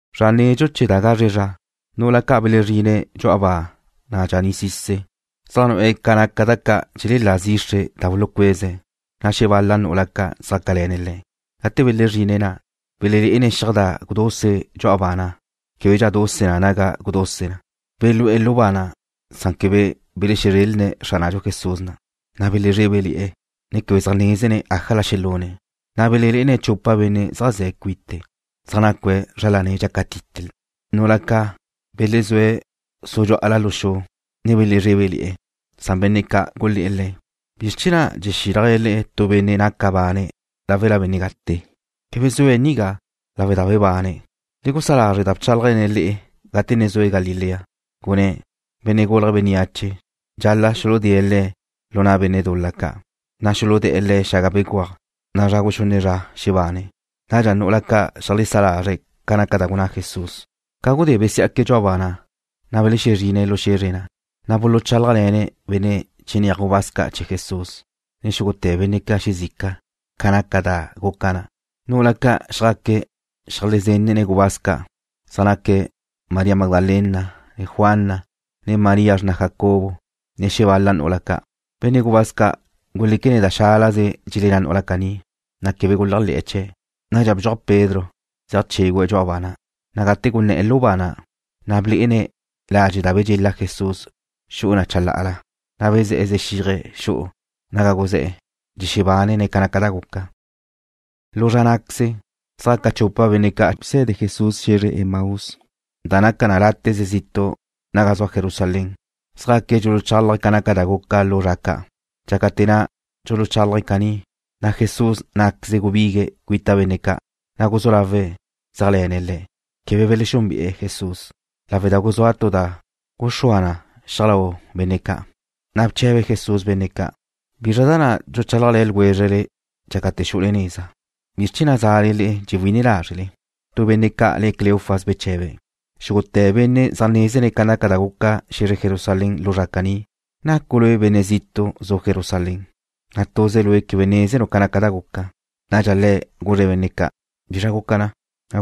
Zra nedxu chee̱ da gazre zra, nu'ula ca' belezrine̱' dxu'a ba na' dxaní'sise̱', zaj nu'e̱ ca naca da ca' dxelelá zixre da bulucueze̱', na' xebal-la nu'ula xjácale̱ne̱' le̱'. Gate belezrine̱' na', belelé'ene̱' xiaj da guduse dxu'a ba na', québedxa naduse na naga guduse na. Belú'e̱ lu ba na', san quebe belexezrelne̱' Xránadxu Jesús na'. Na' belezrébele̱'e̱, ne quebe zaj nézene̱' ájala xelune̱', na' belelé'ene̱' chupa benne' zaj ze̱' cuite̱', zaj nacue̱' zra lane̱' dxácatite na. Nu'ula ca' belezúe̱' sudxú'ala lu xu, ne belezrébele̱'e̱. Na' benne' ca' gulé̱'e̱ le̱': ―¿Bizr chee̱ na' dxexílajle le'e tu benne' naca bane̱' láwela benne' gate? Quebe zue̱' nigá, lawe' da ba bebane̱'. Le gusá lázre' da bchálajle̱ne̱' le'e gate ne zue̱' Galilea. Gunné̱': “Benne' Gulje̱' Bénneache dxal-la' xuludée̱' Le̱' lu na' benne' dul-la ca', na' xuludé̱'e̱ Le̱' xaga béguaj, na' zra guxunne' zra xebane̱'.” Nadxa nu'ula ca' xeajlesá lazre̱' ca naca da gunná Jesús. Ca gudé besiá'que̱' dxu'a ba na', na' belexezrine̱' lu xe̱zre na', na' buluchálajle̱ne̱' benne' chinéaj gubáz ca' chee̱ Jesús, ne xúgute̱ benne' ca' xezica, ca naca da guca na'. Nu'ula ca' xjaque̱' xeajlezenne̱' gubáz ca', zaj naque̱' María Magdalena, ne Juana, ne María xrna Jacobo, ne xebal-la nu'ula ca'. Benne' gubáz ca' guléquene̱' da xálaze dxelenná nu'ula caní, na' quebe guléajle̱'e̱ chee̱'. Nadxa bdxuaj Pedro, zeaj chégüe̱' dxu'a ba na', na' gate guné̱'e̱ lu ba na', blé'ene̱' ladxe' da bedxela Jesús xu'u na chalá'ala, na' bezé̱'e̱ zexíaje̱' xu'u naga guzé̱'e̱, dxexebánene̱' ca naca da guca. Lu zra ná'queze, zjaca chupa benne' ca' busede Jesús xe̱zre Emaús, da naca na láte'ze zitu' naga zua Jerusalén. Zjaque̱' dxuluchálaje̱' ca naca da guca lu zra ca'. Dxácate̱ na' dxuluchálaje̱' caní, na' Jesús ná'queze gubigue̱' cuita benne' ca', na' guzú lawe̱' zéajle̱ne̱' le̱'. Quebe belexúnbe'e̱ Jesús, lawe' da guzúa tu da guxúa na xiaj lau benne' ca'. Nadxa bche̱be Jesús benne' ca': ―¿Bizra da na' dxuchálajle̱ ljwézrele dxácate̱ xu'ule neza? ¿Bizr chee̱ na' zale dxewí'ine lázrele? Tu benne' ca' le̱' Cleofas beche̱be̱': ―Xúgute̱ benne' zaj nézene̱' ca da guca xe̱zre Jerusalén lu zra caní. ¿Nacu' lue' benne' zitu' zu' Jerusalén, na' tuze lue' quebe nézenu' ca da guca na'? Nadxa Le̱' guzre̱' benne' ca': ―¿Bizra guca na'?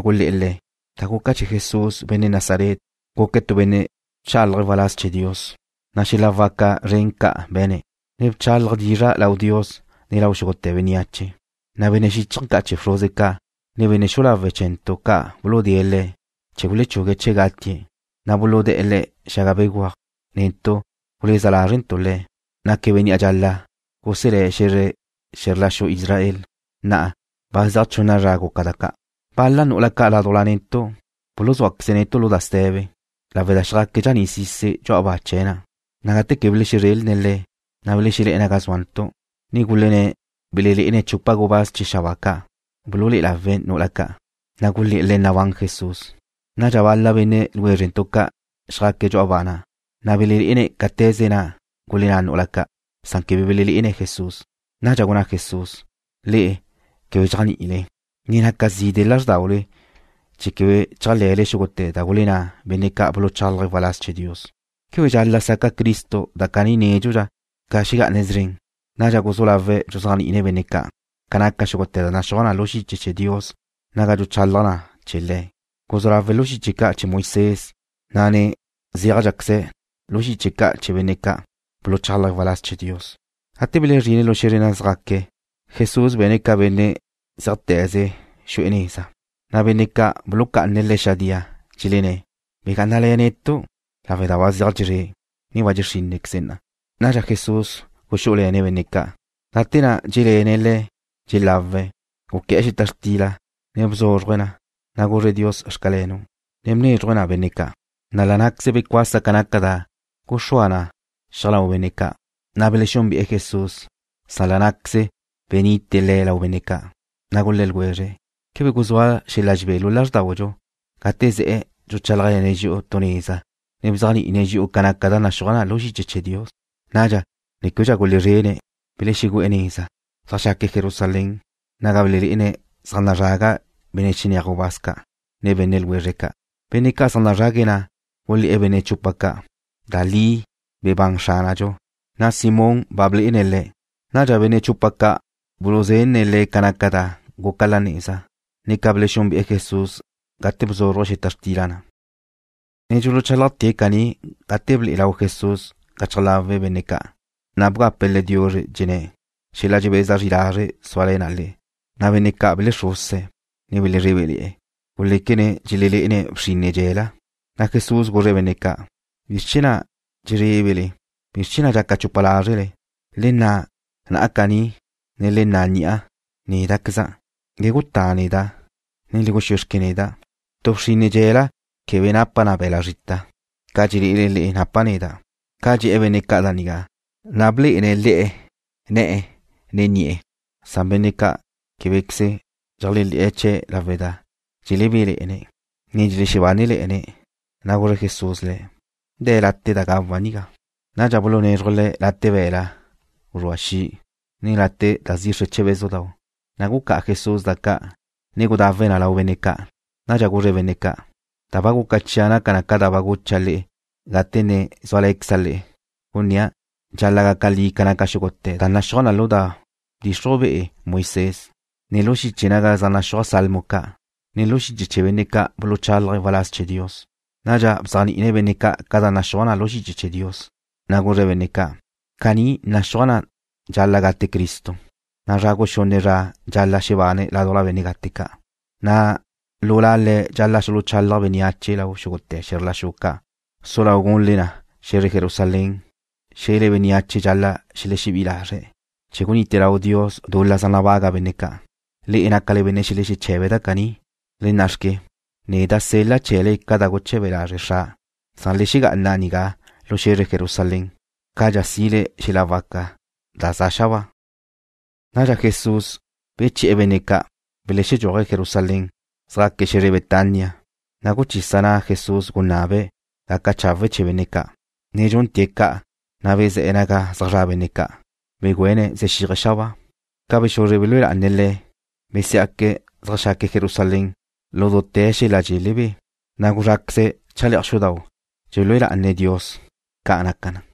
Gulé̱'e̱ Le̱': ―Da guca chee̱ Jesús, benne' Nazaret. Guque̱' tu benne' bchálaje̱' waláz chee̱ Dios, na' xel-la waca zren ca' be̱ne̱', ne bchálaje̱' dizra' lau Dios, ne lau xúgute̱ bénneache. Na' benne' xíchaje̱ ca' chee̱ bxruze ca', ne benne' xu'u lawe' chee̱ntu' ca' buludée̱' Le̱' chee̱ gulechugue̱' chee̱' gatie̱', na' buludé̱'e̱ Le̱' xaga béguaj. Netu' guleza lázrentu' Le̱' naque̱' Benne' dxal-la' guselé̱' xe̱zr la xu Israel. Na'a, ba zeaj chunna zra guca da ca'. Bal-la nu'ula ca' ládujla netu' buluzúaqueze̱' netu' lu da ste̱be, lawe' da xjaque̱' dxaní'sise̱' dxu'a ba chee̱' na', na' gate quebe belexezrelne̱' Le̱', na' belexelé̱'e̱ naga zúantu', ne gulenné̱' belelé'ene̱' chupa gubáz chee̱ xabáa ca' bululé'e lawe̱' nu'ula ca', na' gulé̱'e̱ le̱' nabán Jesús. Nadxa bal-la benne' ljwézrentu' ca' xjaque̱' dxu'a ba na', na' belelé'ene̱' cáte̱ze na' gulenná nu'ula ca', san quebe belelé'ene̱' Jesús. Nadxa gunná Jesús: ―Le'e quebe dxéajni'ile, na' ne naca zide' lázrdaule chee̱ quebe chéajle̱le xúgute̱ da gulenná benne' ca' buluchálaje̱' waláz chee̱ Dios. ¿Quebe dxal-la' saca Cristo da caní nédxudxa ca xegá'ane̱' szren? Nadxa guzú lawe̱' dxuzéajni'ine̱' benne' ca' ca naca xúgute̱ da naxúaj lu xiche chee̱ Dios naga dxuchalaj na chee̱ Le̱'. Guzú lawe̱' lu xiche ca' chee̱ Moisés, na' ne zéajdxaqueze na lu xiche ca' chee̱ benne' ca' buluchálaje̱' waláz chee̱ Dios. Gate belezrine̱' lu xe̱zre naga zjaque̱', Jesús be̱ne̱' ca benne' zeajte̱ze̱' xu'e̱ neza. Na' benne' ca' buluxucá'ane̱' Le̱' xadía, dxelenné̱': ―Begá'anale̱ netu', lawe' da ba zeaj dxezré', ne ba dxe' xrínnequeze na'a. Nadxa Jesús guxú'ule̱ne̱' benne' ca'. Gate na' dxé'le̱ne̱' le̱' dxelawe̱', guqué̱'e̱ xeta xtila, ne bzúzruje̱' na, na' guzre̱' Dios “Xcalenu'”, ne bnézruje̱' na benne' ca'. La' ná'queze becuasa ca naca da guxúa na xiaj lau benne' ca', na' belexúnbe'e̱ Jesús, san la' ná'queze benite Le̱' lau benne' ca'. Na' gulé̱ ljwezre̱': ―¿Quebe guzúa xel-la dxebé lu lázrdaudxu gate ze̱'e̱ dxuchálajle̱ne̱' dxi'u tu neza, ne bzéajni'ine̱' dxi'u ca naca da naxúaj lu xiche chee̱ Dios? Nadxa, ne québedxa gulezrene̱', belexegu'e̱ neza, zeajxaque̱' Jerusalén, naga belelé'ene̱' zaj nazraga benne' chinéaj gubáz ca', ne benne' ljwezre̱' ca'. Benne' ca' zaj nazrague̱' na' gulé̱'e̱ benne' chupa ca': ―Da li bebán Xránadxu, na' Simón ba blé'ene̱' Le̱'. Nadxa benne' chupa ca' buluzenne̱' le̱' ca naca da guca la neza, ne ca belexúnbe'e̱ Jesús gate bzúzruje̱' xeta xtila na'. Ne dxuluchálajte̱' caní gate ble'e lau Jesús gachaj lawe' benne' ca', na' bgape̱' le̱' diuzre, dxenné̱': ―Xela dxebeza zri lazre' súale̱ na le'e. Na' benne' ca' belexruse̱', ne belezrébele̱'e̱. Guléquene̱' dxelelé'ene̱' bxinne dxe̱la. Na' Jesús guzre̱' benne' ca': ―¿Bizr chee̱ na' dxezrébele? ¿Bizr chee̱ na' dxaca chupa lázrele? Le na' na'a caní, ne le na' ni'a. Néda'queza' na'. Le gutá neda', ne le guxúe xque neda'. Tu bxinne dxe̱la quebe napa na be̱la' zrita, ca dxelé'ele le'e napa' neda'. Ca dxe̱'e̱ benne' ca' da nigá, na' blé'ene̱' le̱' ne̱'e̱, ne ni'e̱. Benne' ca' québequeze dxeléajle̱'e̱ chee̱' lawe' da dxelebéle̱'e̱ne̱', ne dxelexebánele̱'e̱ne̱', na' guzre Jesús le̱': ―¿De̱ late' da gawa' nigá? Nadxa bulunézruje̱' Le̱' late' be̱la' guzrúa xi', ne late' da zixre che bézudau', na' gucá'a Jesús da ca', ne gudawe̱' na lau benne' ca'. Nadxa guzre̱' benne' ca': ―Da ba guca chia' naca na ca da gucha' le'e gate ne zúale̱queza' le'e, gunnéa' dxal-la' gaca li ca naca xúgute̱ da naxúaj lu da bdxixruj be'e Moisés, ne lu xiche naga zaj naxúaj salmo ca', ne lu xiche ca' chee̱ benne' ca' buluchálaje̱' waláz chee̱ Dios. Nadxa bzéajni'ine̱' benne' ca' ca da naxúaj lu xiche chee̱ Dios, na' guzre̱' benne' ca': ―Caní naxúaj na dxal-la' gate Cristo, na' zra guxunne' zra dxal-la' xebane̱' ládujla benne' gate ca', na' lu La Le̱' dxal-la' xuluchalaj bénneache lau xúgute̱ xe̱zr la xu ca'. Su lau gunle na lu xe̱zre Jerusalén, xe̱le bénneache dxal-la' xelexebí'i lazre̱' chee̱ gunite lau Dios dul-la zaj nabaga benne' ca'. Le'e nácale benne' xelexeche̱be̱' da caní. ¡Le nna'xque! Neda' sel-la' chee̱le ca da guche̱be lazre' Xra'. Le xegá'ana nigá lu xe̱zre Jerusalén, cadxa si'le xel-la waca da za xabáa. Nadxa Jesús beche̱'e̱ benne' ca', belexedxúaje̱' Jerusalén, xeajxaque̱' xe̱zre Betania, na' guchisa na' Jesús, ne gunabe̱' gaca chawe' chee̱ benne' ca'. Ne dxúntee̱' ca', na' bezé̱'e̱ naga zaj zra' benne' ca', begüéne̱' zexíaje̱' xabáa. Ca bexuzre belúe lá'ane̱' Le̱', besiá'que̱' zeajxaque̱' Jerusalén lu dute̱ xel-la dxelebé, na' gulezráqueze̱' chale'aj xudau' dxelúe lá'ane̱' Dios. Ca' naca na.